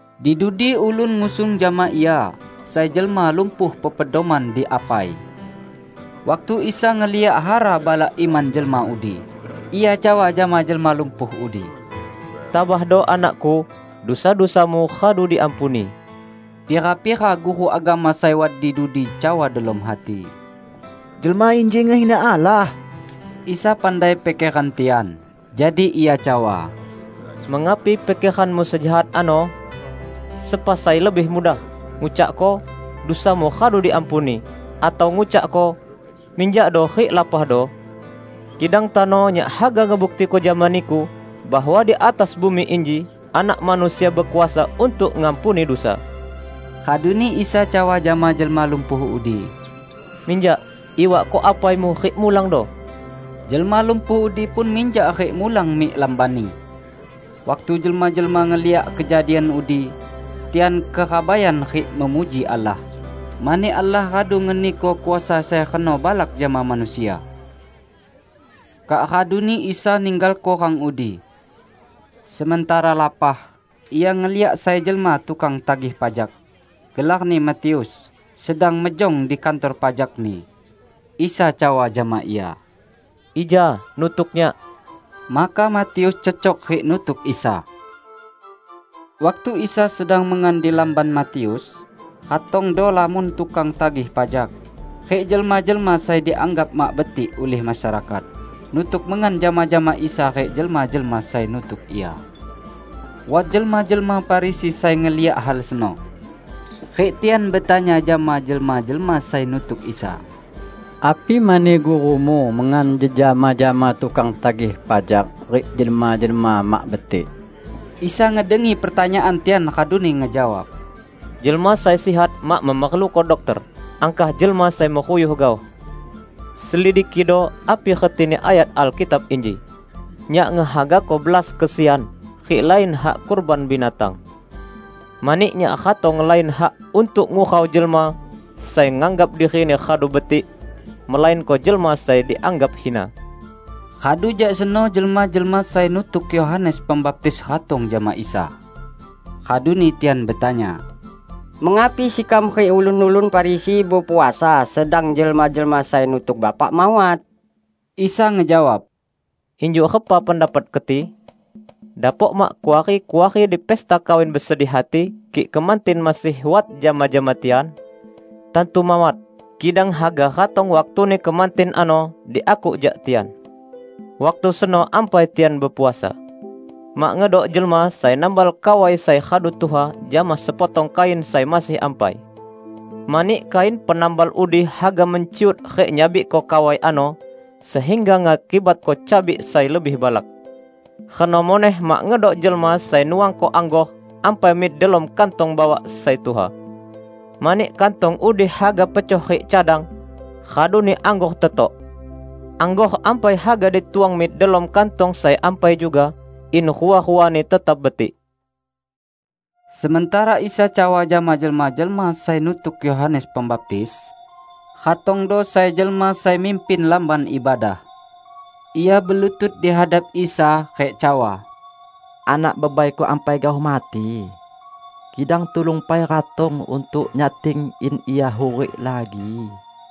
Di dudi ulun ngusung jama Ia sai jelma lumpuh pepedoman di apai. Waktu Isa ngeliak hara balak iman jelma udi, Ia cawa jama jelma lumpuh udi, "Tabahdo, anak-Ku! Dusa-dusamu radu diampuni." Pira-pira guru agama sai wat di dudi cawa delom hati, "Jelma inji ngehina Allah!" Isa pandai pikeran tian, jadi Ia cawa, "Mengapi pikeranmu sejahat ano? Sepa sai lebih mudah: ngucakko, 'Dusamu radu diampuni', atau ngucakko, 'Minjakdo rik lapahdo'? Kidang tano Nyak haga ngebuktiko jama niku bahwa di atas bumi inji Anak Manusia bekuasa untuk ngampuni dusa." Raduni Isa cawa jama jelma lumpuh udi, "Minjak, iwakko apaimu rik mulangdo!" Jelma lumpuh udi pun minjak rik mulang mik lambanni. Waktu jelma-jelma ngeliak kejadian udi, tian kerabaian rik memuji Allah, mani Allah radu ngeniko kuasa sai reno balak jama manusia. Kak raduni Isa ninggalko rang udi. Sementara lapah, Ia ngeliak sai jelma tukang tagih pajak, gelarni Matius, sedang mejong di kantor pajakni. Isa cawa jama ia, "Ija nutuk Nyak!" Maka Matius cecok rik nutuk Isa. Waktu Isa sedang mengan di lamban Matius, ratongdo lamon tukang tagih pajak rik jelma-jelma sai dianggap mak betik ulih masyarakat, nutuk mengan jama-jama Isa rik jelma-jelma sai nutuk Ia. Wat jelma-jelma Farisi sai ngeliak hal seno. Rik tian betanya jama jelma-jelma sai nutuk Isa, "Api mani gurumu mengan jejama jama tukang tagih pajak rik jelma-jelma mak betik?" Isa ngedengi pertanyaan tian raduni ngejawab, "Jelma sai sihat mak memerluko dokter, angkah jelma sai meruyuh gaoh. Selidikido api retini ayat Alkitab inji: 'Nyak ngehagako belas kesian, rik lain hak kurban binatang'. Mani Nyak ratong lain hak untuk ngurau jelma sai nganggap dirini radu betik, melainko jelma sai dianggap hina." Radu jak seno jelma-jelma sai nutuk Yohanes Pembaptis ratong jama Isa. Raduni tian betanya, "Mengapi sekam rik ulun-ulun Farisi bepuasa sedang jelma-jelma sai nutuk Bapak mawat?" Isa ngejawab, "Injuk repa pendapat keti? Dapok mak kuari-kuari di pesta kawin besedih hati kik kemantin masih wat jama-jama tian? Tantu mawat! Kidang haga ratong waktuni kemantin ano diakuk jak tian. Waktu seno ampai tian bepuasa. Mak ngedok jelma sai nambal kawai sai radu tuha jama sepotong kain sai masih ampai. Mani kain penambal udi haga menciut rik nyabikko kawai ano, sehingga ngakibatko cabik sai lebih balak. Reno muneh mak ngedok jelma sai nuangko anggor ampai mik delom kantong bawak sai tuha. Mani kantong udi haga pecoh rik cadang, raduni anggor tetok. Anggor ampai haga dituang mik delom kantong sai ampai juga, in rua-ruani tetap betik." Sementara Isa cawa jama jelma-jelma sai nutuk Yohanes Pembaptis, ratongdo sai jelma sai mimpin lamban ibadah. Ia belutut dihadap Isa rik cawa, "Anak bebaiku ampai gaoh mati. Kidang, tulung pai ratong untuk nyating in ia hurik lagi."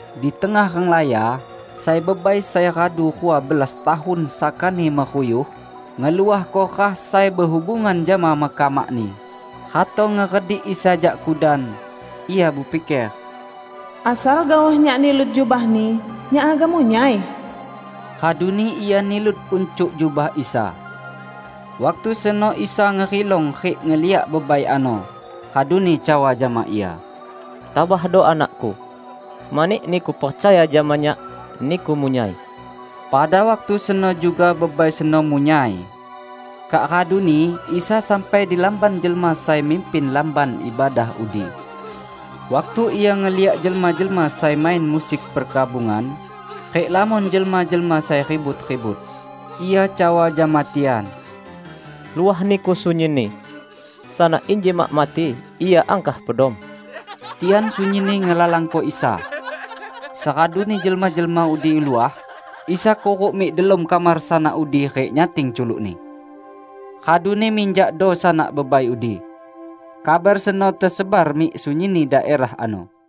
Di tengah renglaya sai bebai sai radu rua belas tahun sakani meruyuh ngeluahko rah sai behubungan jama mekamakni, ratong ngeredik Isa jak kudan. Ia bepiker, "Asal gaoh nyak nilut jubah-Ni, nyak haga munyai." Raduni ia nilut uncuk jubah Isa. Waktu seno Isa ngerilong rik ngeliak bebai ano raduni cawa jama ia, "Tabahdo, anak-Ku! Mani niku percaya jama Nyak, niku munyai!" Pada waktu seno juga bebai seno munyai. Kak raduni Isa sampai di lamban jelma sai mimpin lamban ibadah udi. Waktu Ia ngeliak jelma-jelma sai main musik perkabungan rik lamon jelma-jelma sai ribut-ribut, Ia cawa jama tian, "Luah niku sunyinni! Sanak inji mak mati; ia angkah pedom." Tian sunyinni ngelalangko Isa. Seraduni jelma-jelma udi luah, Isa kuruk mik delom kamar sanak udi rik nyating culukni. Raduni minjakdo sanak bebai udi. Kabar seno tesebar mik sunyinni daerah ano.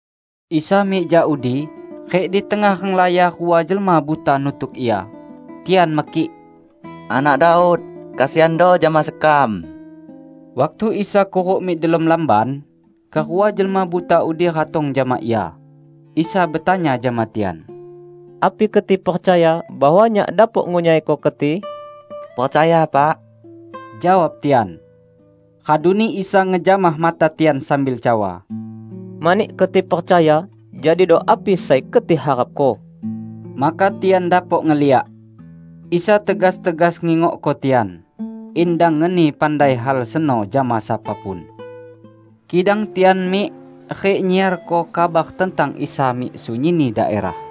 Isa mik jak udi rik di tengah renglaya rua jelma buta nutuk Ia. Tian mekik, "Anak Daud, kesiando jama sekam!" Waktu Isa kuruk mik delom lamban, kerua jelma buta udi ratong jama Ia. Isa betanya jama tian, "Api keti percaya bahwa Nyak dapok ngunyaiko keti?" "Percaya, Pak!" jawab tian. Raduni Isa ngejamah mata tian sambil cawa, "Mani keti percaya, jadido api sai keti harapko." Maka tian dapok ngeliak. Isa tegas-tegas ngingokko tian, in dang ngeni pandai hal seno jama sapa pun. Kidang tian mik rik nyiarko kabar tentang Isa mik sunyinni daerah.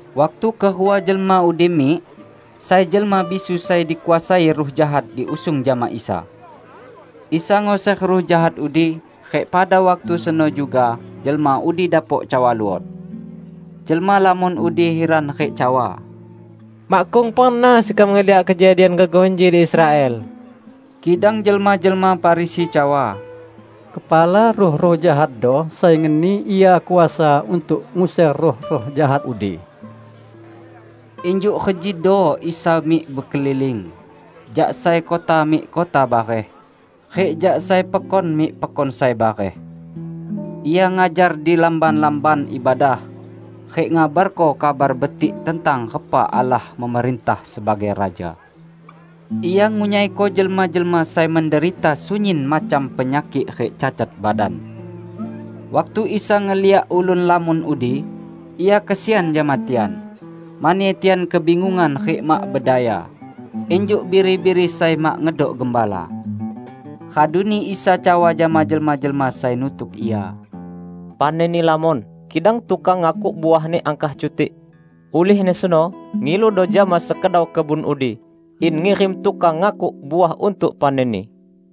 Waktu kerua jelma udi mik, sai jelma bisu sai dikuasai ruh jahat diusung jama Isa. Isa nguser ruh jahat udi rik pada waktu seno juga jelma udi dapok cawa luot. Jelma lamon udi hiran rik cawa, "Makkung pernah sekam ngeliak kejadian gegoh inji di Israel!" Kidang jelma-jelma Farisi cawa, "Kepala ruh-ruh jahatdo sai ngeni Ia kuasa untuk nguser ruh-ruh jahat udi." Injuk rejido Isa mik bekeliling jak sai kota mik kota bareh rik jak sai pekon mik pekon sai bareh. Ia ngajar di lamban-lamban ibadah, rik ngabarko Kabar Betik tentang repa Allah memerintah sebagai Raja. Ia ngunyaiko jelma-jelma sai menderita sunyin macam penyakik rik cacat badan. Waktu Isa ngeliak ulun lamon udi, Ia kesian jama tian, mani tian kebingungan rik mak bedaya, injuk biri-biri sai mak ngedok gembala. Raduni Isa cawa jama jelma-jelma sai nutuk Ia, "Panenni lamon, kidang tukang ngakuk uahni angkah cutik. Ulihni seno ngiludo jama sekedau kebun udi in ngirim tukang ngakuk uah untuk panenni."